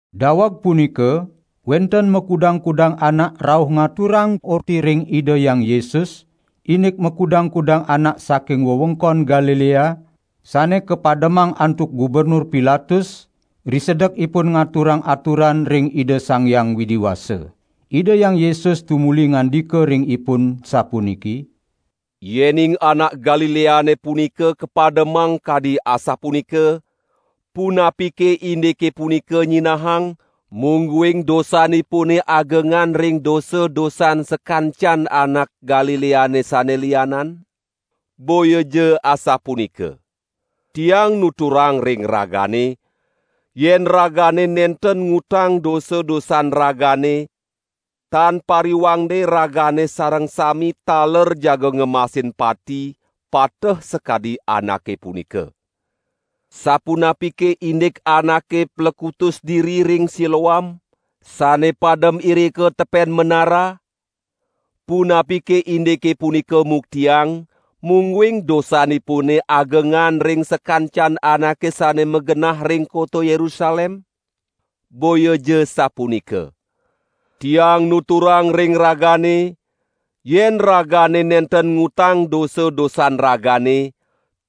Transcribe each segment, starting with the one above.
Daweg punika wenten makudang-kudang anak rauh ngaturang orti ring Ida Hyang Yesus, indik makudang-kudang anak saking wewengkon Galilea sane kapademang antuk Gubernur Pilatus risedek ipun ngaturang aturan ring Ida Sang Hyang Widi Wasa. Ida Hyang Yesus tumuli ngandika ring ipun sapuniki: "Yening anak Galileane punika kapademang kadi asapunika, punapike indike punika nyinahang, mungguing dosanipune agengan ring dosa-dosan sakancan anak Galileane sane lianan? Boyaja asapunika. Tiang nuturang ring ragane, yen ragane nenten ngutang dosa-dosan ragane, tan pariwangde ragane sareng sami taler jaga ngemasin pati, pateh sakadi anake punika. Sapunapike indik anake plekutus diri ring Siloam, sane padem irika tepen menara? Punapike indike punika muktiang, mungguing dosanipune agengan ring sakancan anake sane magenah ring kota Yerusalem? Boyaja sapunika! Tiang nuturang ring ragane, yen ragane nenten ngutang dosa-dosan ragane,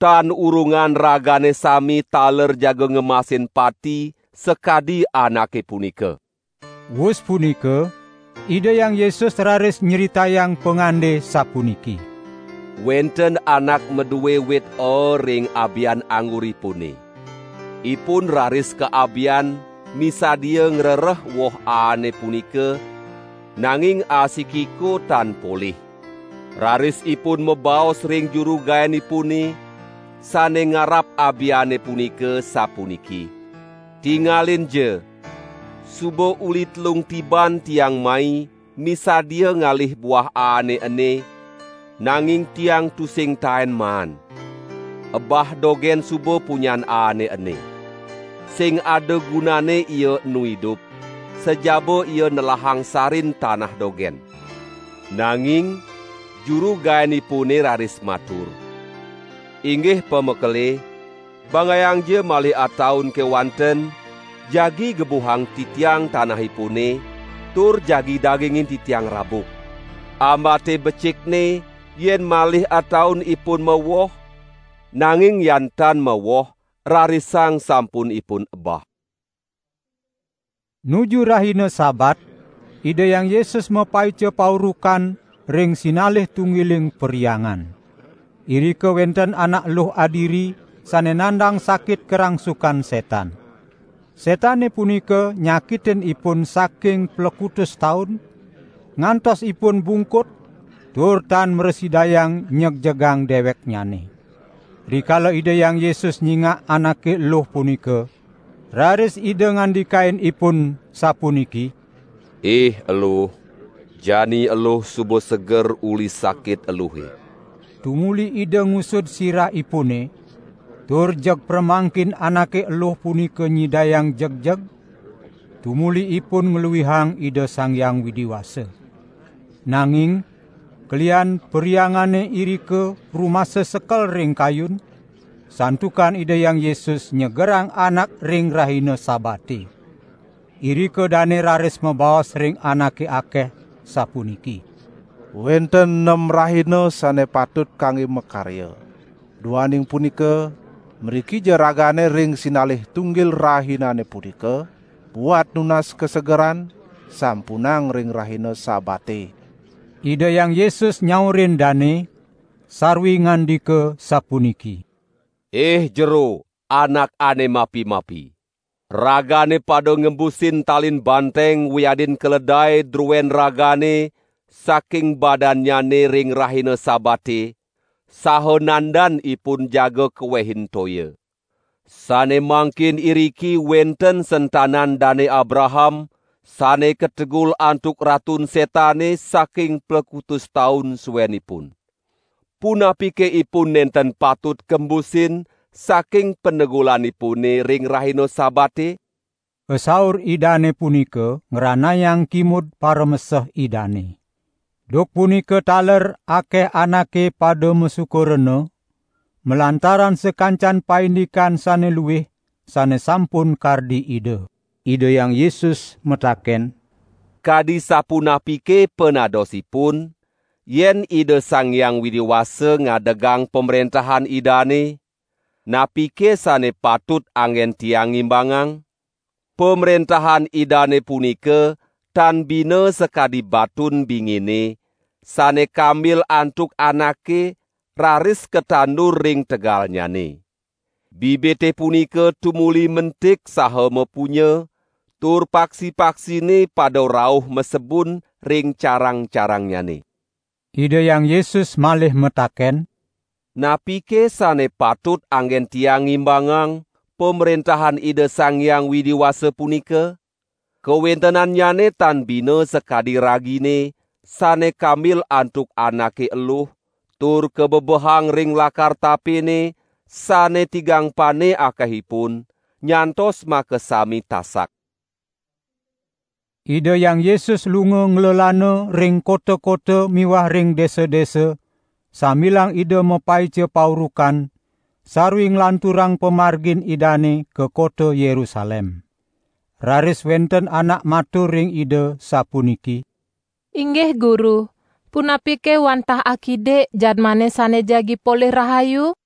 tan urungan ragane sami taler jaga ngemasin pati, sakadi anake punika." Wus punika, Ida Hyang Yesus raris nyritayang pangande sapuniki: "Wenten anak madue wit aa ring abian angguripune. Ipun raris ka abian misadia ngrereh woh aane punika, nanging asikiko tan polih. Raris ipun mabaos ring juru gaenipune, sane ngarap abiane punika, sapuniki: 'Tingalinja, suba uli telung tiban tiang mai misadia ngalih buah aane ene, nanging tiang tusing taen maan. Ebah dogen suba punyan aane ene. Sing ada gunanne ia enu idup, sajaba ia nelahang sarin tanah dogen.' Nanging juru gaenipune raris matur: 'Inggih pamekele, banggayangja malih ataun kewanten, jagi gebuhang titiang tanahipune, tur jagi dagingin titiang rabuk. Ambate becikne, yen malih ataun ipun mawoh, nanging yan tan mawoh, rarisang sampun ipun ebah.'" Nuju rahina Sabat, Ida Hyang Yesus mapaica paurukan ring sinalih tunggiling perhyangan. Irika wenten anak eluh adiri sane nandang sakit karangsukan setan. Setane punika nyakitin ipun saking plekutus taun, ngantos ipun bungkut tur tan mrasidayang nyegjegang deweknyane. Rikala Ida Hyang Yesus nyingak anake eluh punika, raris Ida ngandikain ipun, sapuniki: "Ih eluh, jani eluh suba seger uli sakit eluhe!" Tumuli Ida ngusud sirahipune, tur jeg pramangkin anake eluh punika nyidayang jegjeg tumuli ipun ngluihang Ida Sang Hyang Widi Wasa. Nanging kelihan perhyangane irika rumasa sekel ring kayun santukan Ida Hyang Yesus nyegerang anak ring rahina Sabate. Irika dane raris mabaos ring anake akeh, sapuniki: "Wenten nem rahina sane patut kangge makarya. Duaning punika mrikija ragane ring sinalih tunggil rahinane punika buat nunas kasegeran, sampunang ring rahina Sabate!" Ida Hyang Yesus nyaurin dane, sarwi ngandika sapuniki: "Ih jero, anak sane mapi-mapi! Ragane pada ngembusin talin banteng wiadin keledae druen ragane saking badannyane ring rahina Sabate, saha nandan ipun jaga kawehin toya. Sane mangkin iriki wenten sentanan Dane Abraham sane kategul antuk Ratun Setane saking plekutus taun suenipun. Punapike ipun nenten patut kembusin saking panegulanipune ring rahina Sabate?" Pasaur Idane punika ngranayang kimud parameseh Idane. Duk punika taler akeh anake pada masuka rena, malantaran sakancan paindikan sane luih sane sampun kardi Ida. Ida Hyang Yesus mataken: "Kadi sapunapike panadosipun, yen Ida Sang Hyang Widi Wasa ngadegang Pamrentahan Idane? Napike sane patut anggen Tiang ngimbangang? Pamrentahan Idane punika tan bina sakadi batun bingine, sane kambil antuk anake raris katandur ring tegalnyane. Bibite punika tumuli mentik saha mapunya, tur paksi-paksine pada rauh masebun ring carang-carangnyane." Ida Hyang Yesus malih mataken: "Napike sane patut anggen Tiang ngimbangang Pamrentahan Ida Sang Hyang Widi Wasa punika? Kawentenannyane tan bina sakadi ragine sane kambil antuk anake eluh tur kabebehang ring lakar tapene sane tigang pane akehipun, nyantos makasami tasak." Ida Hyang Yesus lunga nglelana ring kota-kota miwah ring desa-desa sambilang Ida mapaica paurukan sarwi nglanturang pamargin Idane ka kota Yerusalem. Raris wenten anak matur ring Ida sapuniki: "Inggih Guru, punapike wantah akidik jadmane sane jagi polih rahayu?"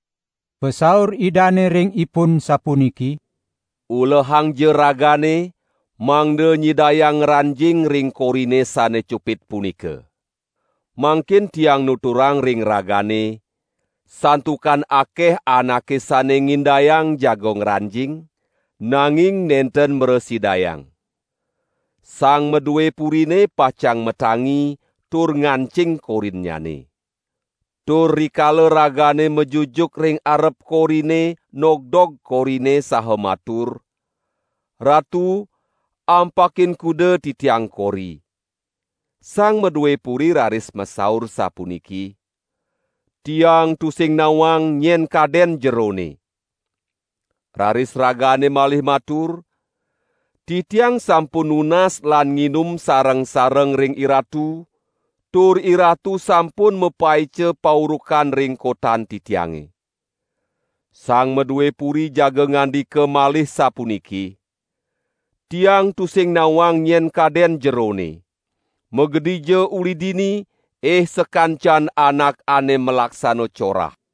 Pasaur Idane ring ipun, sapuniki: "Ulehangja ragane mangda nyidayang ngranjing ring korine sane cupit punika! Mangkin Tiang nuturang ring ragane, santukan akeh anake sane ngindayang jaga ngranjing, nanging nenten mrasidayang. Sang madue purine pacang matangi tur ngancing korinnyane. Tur rikala ragane majujuk ring arep korine nogdog korine saha matur: 'Ratu ampakin kuda titiang kori!', sang madue puri raris masaur sapuniki: 'Tiang tusing nawang nyen kaden jerone!' Raris ragane malih matur: 'Titiang sampun nunas lan nginum sareng-sareng ring iratu, tur iratu sampun mapaica paurukan ring kotan titiange.' Sang madue puri jaga ngandika malih sapuniki: 'Tiang tusing nawang nyen kaden jerone! Magedija uli dini, ih sakancan anak ane malaksana corah!'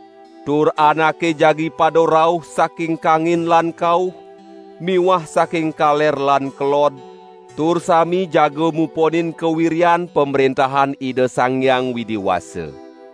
Tur anake jagi pada rauh saking kangin lan kauh miwah saking kaler lan kelod, tur sami jaga muponin kawiryan Pamrentahan Ida Sang Hyang Widi Wasa.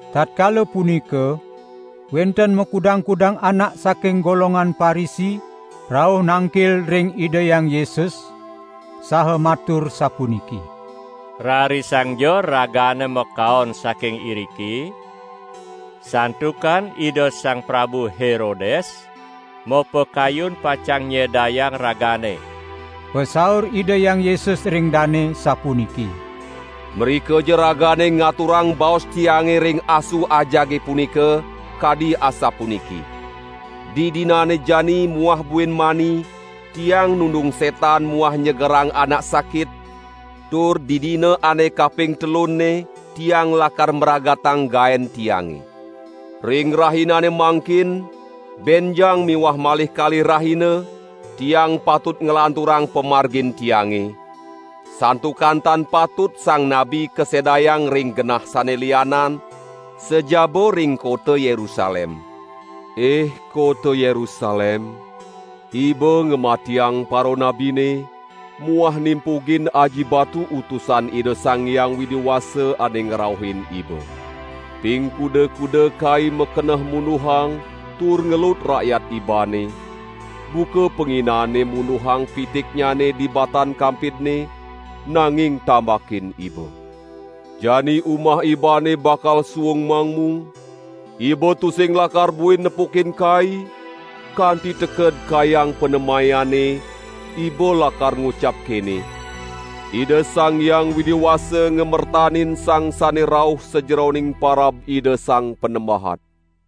Tatkala punika wenten makudang-kudang anak saking golongan Parisi rauh nangkil ring Ida Hyang Yesus, saha matur sapuniki: "Rarisangja Ragane makaon saking iriki, santukan Ida Sang Prabu Herodes mapakayun pacang nyedayang Ragane." Pasaur Ida Hyang Yesus ring dane sapuniki: "Mrikaja ragane ngaturang baos Tiange ring asu ajage punika, kadi asapuniki: 'Didinane jani muah buin mani Tiang nundung setan muah nyegerang anak sakit, tur didina ane kaping telunne Tiang lakar mragatang gaen Tiange.' Ring rahinane mangkin, benjang miwah malih kalih rahina, Tiang patut nglanturang pamargin Tiange; santukan tan patut sang nabi kasedayang ring genah sane lianan, sajaba ring kota Yerusalem. Ih kota Yerusalem. Iba nyedayang paranabine muah nimpugin aji batu utusan Ida Sang Hyang Widi Wasa ane ngrauhin iba. Ping kuda-kuda Kai makeneh munduhang tur ngelut rakyat ibane, buka panginane munduhang pitiknyane di batan kampidne, nanging tambakin iba. Jani umah ibane bakal suung mangmung, iba tusing lakar buin nepukin Kai, kanti teked kayang panemayane, iba lakar ngucap kene: 'Ida Sang Hyang Widi Wasa ngamertanin sang sane rauh sajeroning parab Ida Sang Panembahan.'"